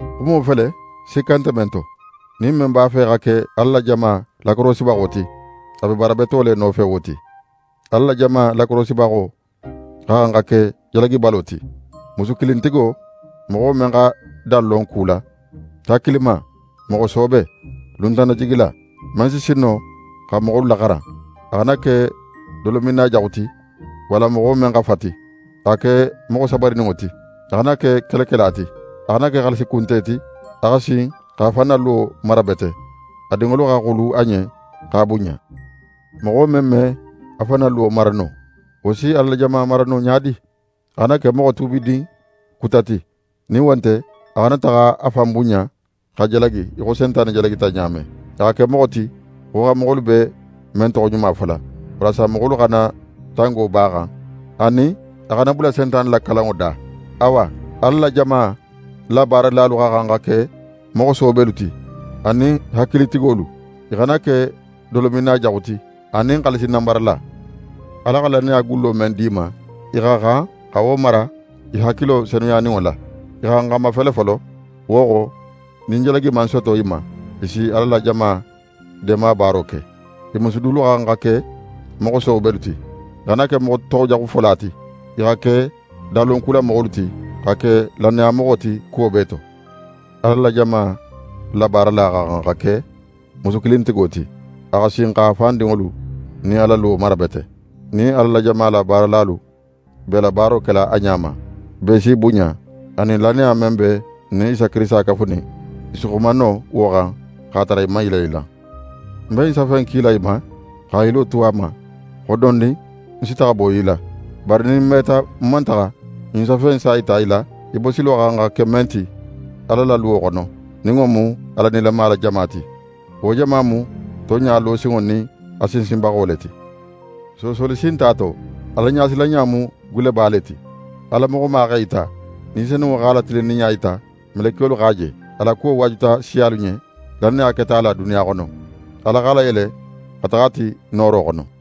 Xumo fele, sikka nte men to: Nin men b'a fe xa ke Ala la jama lakorosibaxo ti, a be baara beto le nofe wo ti. Ala la jama lakorosibaxo xa xan xa ke jalagibalo ti, musukilintigo, moxo men xa dan lon ku la, hakilima, moxo soobe, luntannajigila, men si sin no xa moxolu laxaran. A xana ke dolominna jaxu ti, walla moxo men xa fati. A xa ke moxo sabarininŋo ti. A xana ke kelekela ti. A xana ke xaalisi kunte ti. A xa sin x'a fan na luwo mara bete, a dinŋolu xa xulu a ɲen x'a bunɲa. Moxo men me a fan na luwo mara no, wo si Ala la jama mara no ɲa di? A xana ke moxo tuubidin kuta ti; nin wo nte a xana taxa a fan bunɲa, xa jalagi í xo Sentane jalagita ɲa men. A xa ke moxo ti, xoxanmoxolu be men toxoɲuma fola; walasa moxolu xana tango b'a xan, anin a xana bula Sentane la kalanŋo da. Awa, Ala la jama la baaralalu xa xan xa ke moxo soobelu ti, anin xankilintigolu. I xana ke dolominna jaxu ti, anin xaalisi nanbarala. Ala xa lannaya gullo men di i ma, i xa xan xa wo mara i hakilo senuyaninŋo la. I xa xan xa mafele folo, wo xo nin jalagi man soto i ma, i si Ala la jama deemabaaro ke. I musu dulu xa xan xa ke moxo soobelu ti. I xana ke moxo toxojaxufola ti. I xa ke danlonkulamoxolu ti, xa ke lannayamoxo ti kuwo bee to. Ala la jama la baarala xa xan xa ke musukilintigo ti. A xa sin x'a fan dinŋolu nin a la luwo mara bete. Nin Ala la jama la baaralalu b'e la baaro kela a ɲa ma, bee s'i bunɲa. Anin, lannaya men be n nin Isa Kirisita kafunin, i si xuma no wo xan x'a tara i man yilanyilan. Ń be ɲin safe in kila í ma, xa ń yilo tu a ma, xo dondin ń si taxa bo í la. Bari nin ń meta ń man taxa, ɲin safe in s'a yita í la, í bosilo xa xan xa ke men ti Ala la luwo xono, nin wo mu Ala nilama la jama ti. Wo jama mu tonɲa losinŋo nin a sinsinbaxo le ti. Soosoli si nte a to, Alaɲasilanɲa mu gulleba le ti! Ala moxoma x'é yita, Ni Senunŋo x'a la tilinninɲa yita. Melekiyolu x'a je. A la kuwo waajuta siyalu ɲen. Lannaya keta a la duniya xono. Ala x'a layele xa taxa a ti nooro xono.